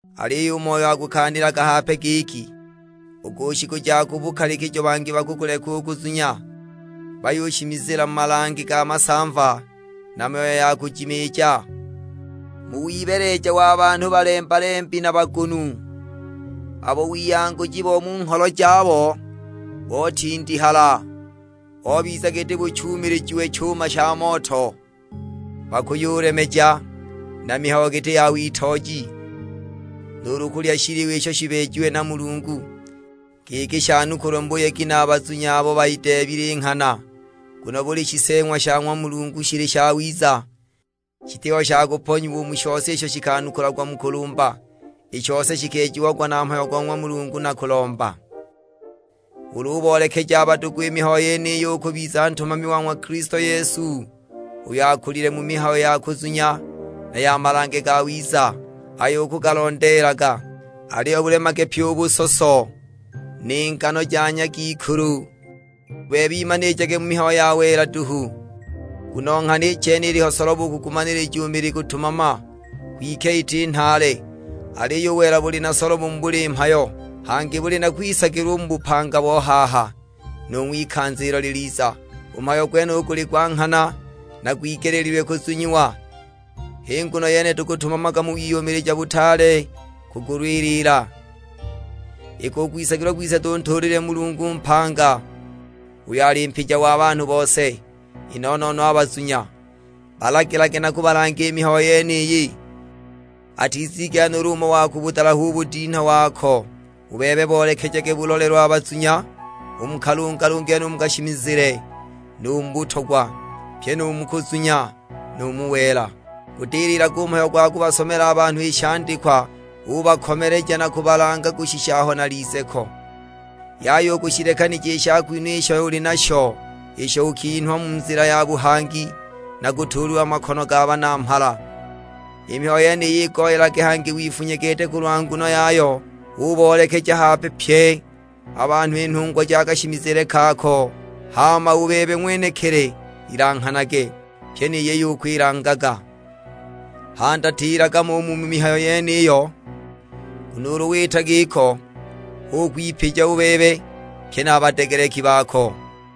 Aliyo u Moyo akukaanilaga hape giki, u ku shiku ja ku bukalikijo bangi bakukuleka u kuzunya, bayushimizila mu malange ga masamva na myoyo ya kujimiija, mu wibeeleja wa banhu balemba-lembi na bagunu, abo wiyanguji bo mu ngholo jabo botindihala, bobiza giti buchuumilijiwe chuma sha moto. Bakuyulemeja na mihayo giti ya witooji, nuulu kulya shiliwa isho shibeejiwe na Mulungu, giki shanukulwe mu buyegi na a bazunya abo bayideebile i nghana. Nguno buli shiseeng'wa sha ng'wa Mulungu shili shawiza; shitiho sha kuponyiwa u mu shose isho shikanukulagwa mu kulumba. I shose shikeejiagwa na mhayo go ng'wa Mulungu na kulomba. Ulu uboolekeja a badugu i mihayo yeniyi ukubiza ntumami wa ng'wa Kilisto Yesu, uyo akulile mu mihayo ya kuzunya na ya malange gawiza, ayo ukugalondeelaga. Aliyo bulemage pyi u busoso, ni ngano ja nyagikulu; u bebe imanilijage mu mihayo ya wela duhu. Nguno nghana i chene iliho solobo u kugumanilija u mili kutumama, kwike iti nhaale. Aliyo u wela buli na solobo mu buli mhayo, hangi buli na kwisagilwa u mu bupanga bo haha, nu ng'wikanza ilo liliza. U mhayo gwenuyu guli gwa nghana, na gwigeleelilwe kuzunyiwa. H'i nguno yene tukutumamaga mu wiyumilija butaale kugulwilila, iki u kwisagilwa kwise tuntuulilile Mulungu mpanga, uyo ali mpija wa banhu bose; i no-no-no a bazunya. Balagilage na kubalanga i mihayo yeniyi; atizigela nuulu umo wa kubudalaha u budinha wako. U bebe boolekejage bulolelo a bazunya, u mu kalungalungile nu mu kashimizile, nu mu butogwa; pye nu mu kuzunya, nu mu wela. Gudililage u mhayo gwa kubasomela a banhu i shandikwa, ubakomeleja na kubalanga kushisha aho nalize ko. Yaya u kushilekanija i shakwinhwa isho uli nasho, isho ukinhwa mu nzila ya buhangi na kutuulilwa makono ga banamhala. I mihayo yeniyi igoyelage, hangi wifunye gete kulwa nguno yayo; uboolekeja hape pye a banhu i nhungwa ja kashimizile kako. Hama u bebe ng'wenekili ilanghanage, pyi ni yiyo ukwilangaga. Handatilaga mo u mu mihayo yeniyo, nguno ulu wita giko hu ukwipija u bebe, pye na a badegeleki bako!